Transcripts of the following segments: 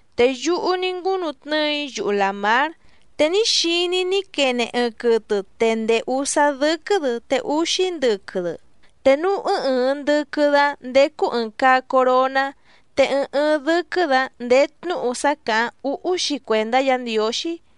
Te yúhú ní ngúnu tnɨ́ɨ‑í yuhu làmár, te ní xiní‑í ní quene ɨɨⁿ quɨtɨ te ndèé úsá dɨ́quɨ́‑dɨ te úxí ndɨquɨ‑dɨ, te núú ɨɨⁿ ɨɨⁿ ndɨquɨ‑dɨ‑áⁿ ndécú ɨ̀ɨⁿ caa coroná. Te ɨɨⁿ ɨɨⁿ dɨ́quɨ́‑dɨ‑áⁿ ndèé tnúhu sá càháⁿ úhú‑xi cuèndá Yǎ Ndiǒxí.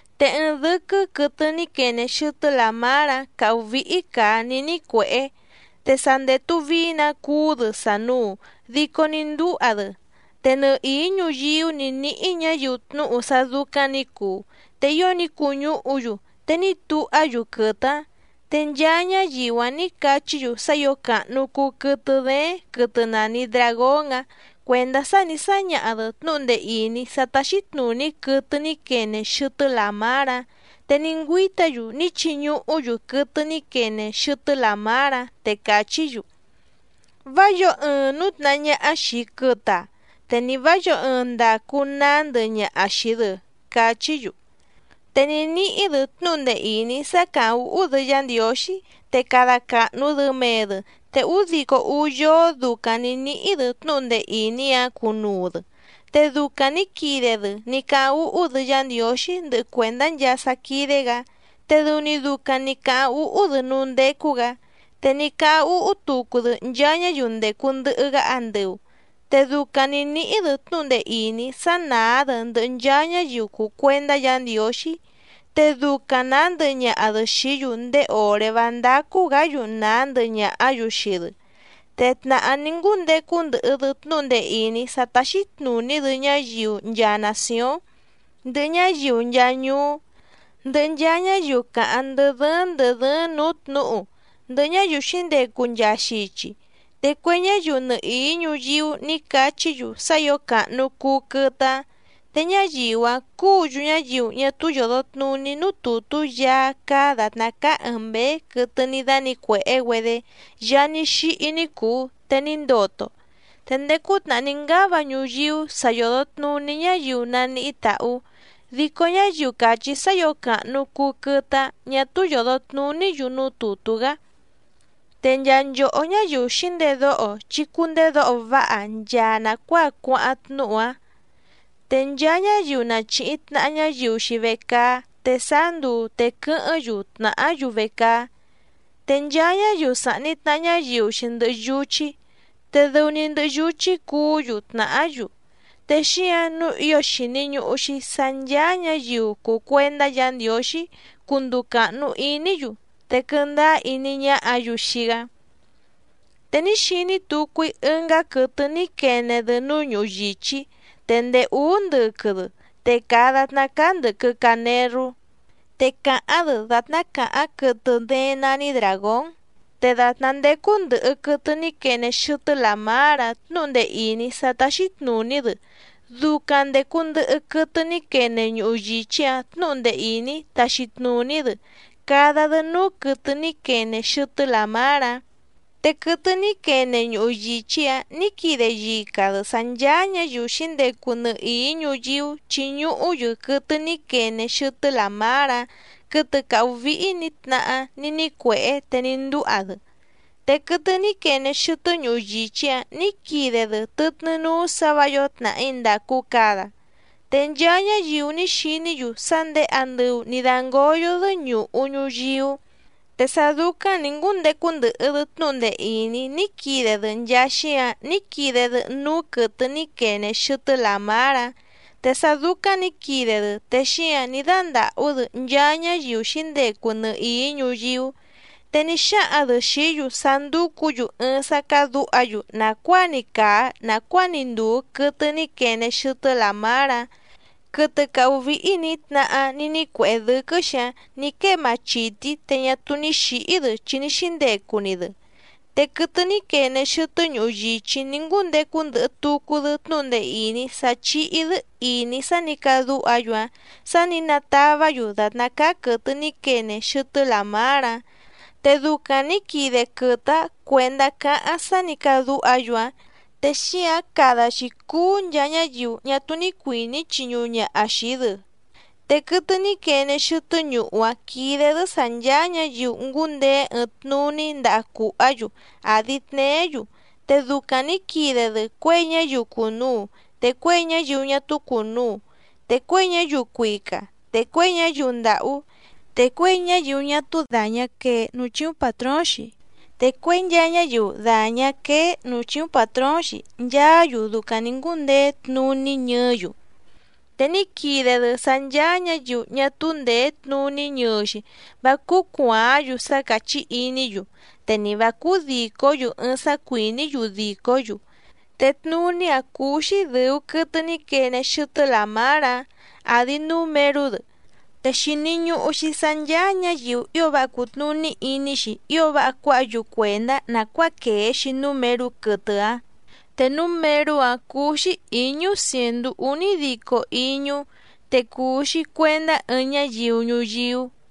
Te ɨɨⁿ dɨ́quɨ́ quɨtɨ ní quene xɨtɨ́ làmár‑áⁿ càhú víhí càa ní nícuèhé, te sa ndètu vií‑nǎ cuú‑dɨ sànuu dico ní ndúha‑dɨ, te nɨhìí ñuyíú nǐ níhí ñǎyiu tnúhu sá dúcáⁿ nǐ cuu, te ío ní cuñúhu‑yu te ní tuhá‑yu quɨtɨ‑áⁿ. Te nchaa ñáyiu‑áⁿ nǐ cachí‑yu sá ǐo càhnu cuu quɨtɨ dééⁿ quɨtɨ nàni dragón‑áⁿ cuèndá sá nì sáñaha‑dɨ tnúhu ndee ìní sá táxí tnùní quɨtɨ ní quene xɨtɨ́ làmár‑áⁿ, te ní ngüíta‑yu ní chiñuhú‑yu quɨtɨ ní quene xɨtɨ́ làmár‑áⁿ, te càchí‑yu: —Vá yǒo ɨɨⁿ nǔtnahá ñáhá xìi quɨtɨ‑a, te ni vǎ yǒo ɨɨⁿ ndacu nàá ndɨhɨ ñaha xìi‑dɨ —cachí‑yu. Te ní níhí‑dɨ tnúhu ndee ìní sá càháⁿ úhú‑dɨ Yá Ndiǒxí, te cada càhnu‑dɨ mee‑dɨ, te údico úú yóó ducaⁿ nǐ níhí‑dɨ tnúhu ndee ìní‑áⁿ cunuu‑dɨ. Te ducaⁿ nǐ quide‑dɨ ní cáháⁿ úhú‑dɨ Yá Ndiǒxí ndɨhɨ cuèndá nchaa sá quídé‑gǎ, te dɨu‑ni ducaⁿ nǐ cáháⁿ úhú‑dɨ núú ndécú‑gǎ, te ní cáháⁿ úhú tucu‑dɨ nchaa ñáyiu ndècu ndɨhɨ‑gá andɨu. Te ducaⁿ nǐ níhí‑dɨ tnúhu ndee ìní sá nàá‑dɨ ndɨhɨ nchaa ñáyiu cùu cuendá Yǎ Ndiǒxí, te ducaⁿ nàá ndɨhɨ ñaha‑dɨ xìí‑yu ndéé òré vá ndácú‑gǎ‑yu nàá ndɨhɨ ñàhá‑yu xii‑dɨ, te tnàhá ní ngúndecu ndɨhɨ‑dɨ tnúhu ndee ìní sá táxí tnùní‑dɨ ñáyiu nchaa nàcióⁿ, ndɨhɨ ñáyiu nchaa ñuú, ndɨhɨ nchaa ñáyiu càháⁿ ndɨ́ dɨ́ɨ́ⁿ ndɨ̀ dɨ́ɨ́ⁿ nǔú tnǔhu, ndɨhɨ ñáyiu xǐndecu nchaa xichi. Te cue ñáyiu nɨhìí ñuyíú nǐ cachí‑yu sá ǐo càhnu cuu quɨtɨ‑áⁿ, te ñáyiu‑áⁿ cúǔ‑yu ñáyiu ñá túú yòdo tnuní núú tùtú Yaá cáá dàtná cáá ɨ̀ɨⁿ mbéé quɨtɨ ní dánǐcuèhé‑güedé Yaá ní xíhí ní cùu te ní ndoto. Te ndéé cútnàhá ní ngáva ñuyíú sa yòdo tnuní ñáyiu naníhí tàhú, dico ñáyiu càchí sá ǐo càhnu cuu quɨtɨ‑áⁿ ñà túú yòdo tnuní‑yu núú tùtú‑gá. Te nchaa nchòhó ñáyiu xǐndedóho chí cúndèdóho váha nchaa nàcuáa cuáháⁿ tnúhu‑áⁿ. Te nchaa ñáyiu na chìhi tnaha ñáyiu‑xi vecaá te sáá nduu te quɨ́hɨ́ⁿ‑yu tnàhá‑yu vecaá, te nchaa ñáyiu sàhni tnaha ñáyiu‑xi ndɨhɨ yuchí te dɨu‑ni ndɨhɨ yuchí cuú‑yu tnàhá‑yu, te xíǎⁿ nǔu ío xìni ñuhu‑xi sá ncháá ñǎyiu cùu cuendá Yǎ Ndiǒxí cunduu càhnu iní‑yu, te quɨndáá iní ñáhǎ‑yu xii‑gá. Te ní xiní tucu‑í ɨngá quɨtɨ ní quene‑dɨ núú ñuhu yìchí, te ndèé úú ndɨquɨ‑dɨ te càa datná cáá ndɨ̀quɨ canerú, te càháⁿ‑dɨ dàtná càháⁿ quɨtɨ dééⁿ nání dràgón. Te dàtná ndécú ndɨ̀hɨ quɨtɨ ní quene xɨtɨ́ làmár‑áⁿ tnǔhu ndee ìní sá táxí tnùní‑dɨ ducaⁿ ndècu ndɨhɨ quɨtɨ ní quene ñuhu yìchí‑áⁿ tnǔhu ndee ìní taxi tnùní‑dɨ cada‑dɨ núú quɨtɨ ní quene xɨtɨ́ làmár‑áⁿ, te quɨtɨ ní quene ñuhu yìchí‑áⁿ nǐ quide yica‑dɨ sǎ ncháá ñǎyiu xǐndecu nɨhìí ñuyíú chiñuhú‑yu quɨtɨ ní quene xɨtɨ́ làmár‑áⁿ, quɨtɨ càhú víhí nǐ tnahá ní nícuèhé te ní ndúha‑dɨ. Te quɨtɨ ní quene xɨtɨ́ ñuhu yìchí‑áⁿ nǐ quide‑dɨ tɨtnɨ́ núú sǎ vǎ yǒo tnàhí ndàcu cada, te nchaa ñáyiu ní xiní‑yu sá ndèé andɨu nǐ dángóyó‑dɨ́ ñùhú ñuyíú. Te sá dúcáⁿ nǐ ngúndecu ndɨhɨ‑dɨ tnúhu ndee ìní ní quide‑dɨ nchaa xíǎⁿ ní quide‑dɨ núú quɨtɨ ní quene xɨtɨ́ làmár‑áⁿ, te sá dúcáⁿ nǐ quide‑dɨ te xíǎⁿ ní dándàhú‑dɨ nchaa ñáyiu xǐndecu nɨhìí ñuyíú, te ní xáhaⁿ‑dɨ xìí‑yu sá ndúcǔ‑yu ɨɨⁿ sá cádǔha‑yu nàcuáa‑ni càa nacuáa‑ni ndùu quɨtɨ ní quene xɨtɨ́ làmár‑áⁿ, quɨtɨ càhú víhí nǐ tnahá ní nícuèhé dɨ́quɨ́‑xi‑áⁿ nǐ quée machìtí te ñá túú ní xǐhí‑dɨ chi ní xíndecu‑ni‑dɨ. Te quɨtɨ ní quene xɨtɨ́ ñuhu yìchí ní ngúndecu ndɨhɨ tucu‑dɨ tnúhu ndee ìní sá chíhí‑dɨ́ ìní sá nǐ cadúha‑yu‑áⁿ, sá nǐ natavá‑yu dàtná cáá quɨ̀tɨ ní quene xɨtɨ́ làmár‑áⁿ, te ducaⁿ nǐ quide quɨtɨ‑áⁿ cuèndá cáháⁿ sá nǐ cadúha‑yu‑áⁿ, te xíǎⁿ cada‑xi cuú nchaa ñáyiu ñá túú ní cuìní chiñuhu ñaha xii‑dɨ. Te quɨtɨ ní quene xɨtɨ́ ñuhu‑áⁿ quídé‑dɨ́ sǎ ncháá ñǎyiu ngúndeé ɨɨⁿ tnuní ndaha cùhá‑yu àdi tneé‑yu, te ducaⁿ nǐ quide‑dɨ cuěi ñáyiu cùnuu te cuěi ñáyiu ñá túú cùnuu, te cuěi ñáyiu cuica te cuěi ñáyiu ndàhú, te cuěi ñáyiu ñá túú dàñá quee núú chíúⁿ pàtróóⁿ‑xi, te cuěi nchaa ñáyiu dàñá quéé nǔú chíúⁿ pàtróóⁿ‑xi nchaá‑yu ducaⁿ nǐ ngúndeé tnuní ñɨɨ́‑yu. Te ní quide‑dɨ sá ncháá ñǎyiu ñá túú ndèé tnuní ñɨɨ‑xi vá cúú cuàáⁿ‑yu sá càchí iní‑yu te ni vǎ cúú dìcó‑yu ɨɨⁿ sá cuìní‑yu dìcó‑yu, te tnuní‑áⁿ cúú‑xí dɨ̀u quɨtɨ ní quene xɨtɨ́ làmár‑áⁿ àdi númerú‑dɨ. Te xìni ñuhu‑xi sá ncháá ñǎyiu ío váha cùtnuní iní‑xi ío váha cuáha‑yu cuèndá nàcuáa quèe‑xi númerú quɨtɨ‑áⁿ, te númerú‑áⁿ cúú‑xí ǐñú cièndú únídico íñú, te cùu‑xi cuendá ɨɨⁿ ñáyiu ñuyíú.